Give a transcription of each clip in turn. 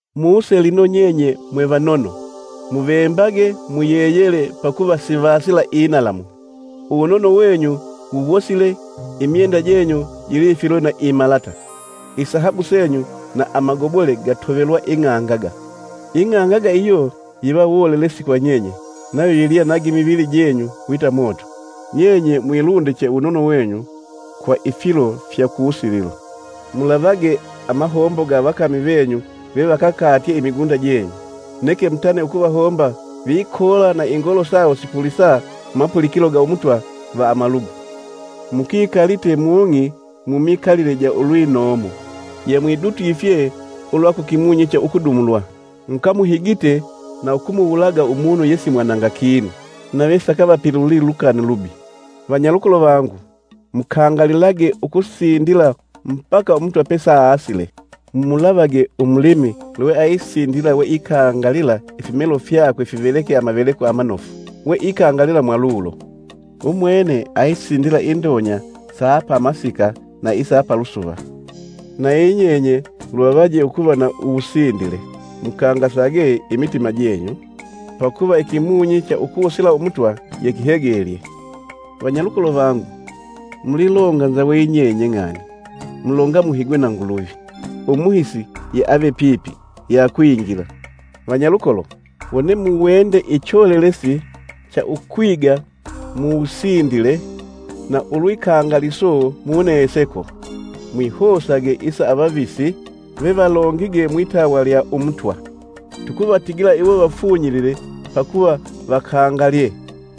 Muse lino nyenye mwevanono! Muvembage muyeyele pakuva sivasila inalamu. Uwunono wenyu wuwosile, imyenda jenyu jilifilwe na imalata. Isahabu senyu na amagobole gatovelwa ing'angaga, ing'angaga iyo yiva wolelesi kwa nyenye nayo yilya na gimivili jenyu wita moto. Nyenye mwilundiche uwunono wenyu kwa ifilo fya ku wusililo! Mulavage, amahombo ga avakami venyu, ve vavakakalye imigunda jenyu, neke mutane ukuvahomba vikoola na ingoolo sawo sipulisa mumapulikilo ga Umutwa va amalugu. Mukikalite mung'i mumikalile ja ulwinomo. Yemwidutwifye ulwa ku kimunyi cha ukudumulwa. Mukamuhigite na ukumuwulaga umunu yesimwananga kinu, nave sakavapiluli lukani lubi. Vanyalukolo vangu, mukangalilage ukusindila mbaka Umutwa pesaasile. Mumulavage, umulimi lweaisindila we ikangalila ifimelo fyakwe amaveleko isanga amanofu, weikangalila mwalulo. Umwene ayisindila angalyye indonya sa pamasika na isa palusuva. Nayi nyenye luvavaje ukuva na uwusindile; mukangasage imitima jenyu, pakuva ikimunyi cha ukusila Umutwa yekihegelye. Vanyalukolo vangu, mulilonganza we yinyenye ng'ani mulonga muhigwe na Nguluvi. Umuhisi ye ave pipi, yakwingila. Vanyalukolo, wone muwende icholelesi cha ukwiga mu wusindile na ulwikangaliso muneseko, mwihosage isa avavisi vevalongige mwitawa lya Umutwa. Tukuvatigila iwo vafunyilile pakuva vakangalye.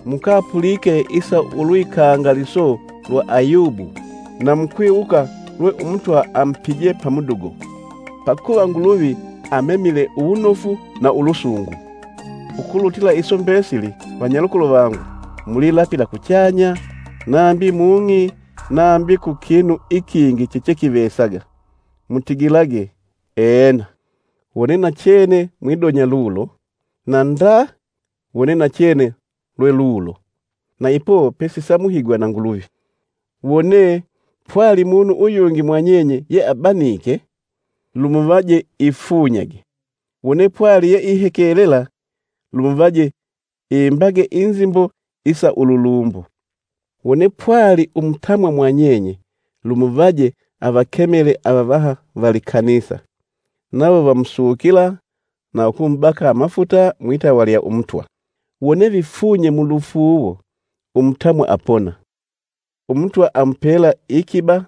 Mukapulike isa ulwikangaliso lwa Ayubu, na mukwiwuka lwe umutwa amupije pamudugo. Pakuva Nguluvi amemile uwunofu na ulusungu. Ukulutila iso mbesili, vanyalukolo vangu, mulilapila kuchanya, nambi mung'i nambi ku kinu ikingi chechekivesaga. Mutigilage, “Ena.” Wone nachene mwidonya lulo, na “Nda.” Wone nachene lwelulo, na ipo pesisamuhigwa na Nguluvi. Wone, pwali munu uyungi mwanyenye yeabanike, lumuvaje ifunyage. Wone, pwali yeihekelela lumuvaje imbage inzimbo isa ululumbo. Wone pwali umutamwa mwanyenye lumuvaje avakemele avavaha va likanisa, nawo vamusukila na ukumubaka amafuta mwitawa lya Umutwa. Wone vifunye mulufuuwo umutamwa apona; Umutwa amupela ikiba,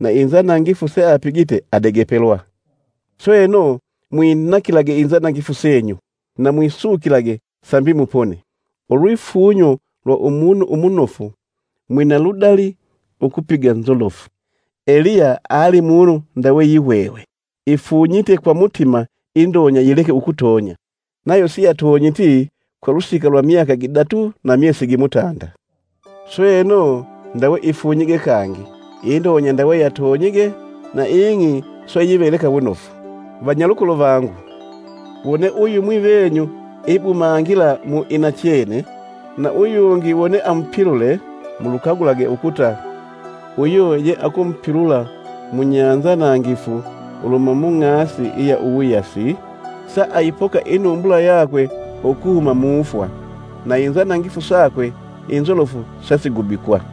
na inzanangifu seapigite adegepelwa. Sweno, mwinaakilage inzanangifu senyu, na mwisukilage, sambi mupone. Ulwifunyo lwa umunu umunofu mwina ludali ukupiga nzolofu. Eliya ali munu ndawe yihwehwe. Ifunyite kwa mutima indonya yileke ukutonya, nayo siyatonyiti kwa lusika lwa myaka gidatu na myesi gimutanda. Sweno, ndawe ifunyige kangi, indonya ndawe yatonyige; na ing'i swe yiveleka wunofu. Vanyalukolo vangu, wone uyumwi venyu ibumangila mu inachene, na uyungi wone amupilule mulukagulage ukuta, uyo yeakumupilula munyanzanangifu uluhuma mung'asi iya uwuyasi, saayipoka inumbula yakwe ukuhuma mufwa, na inzanangifu sakwe inzolofu sasigubikwa.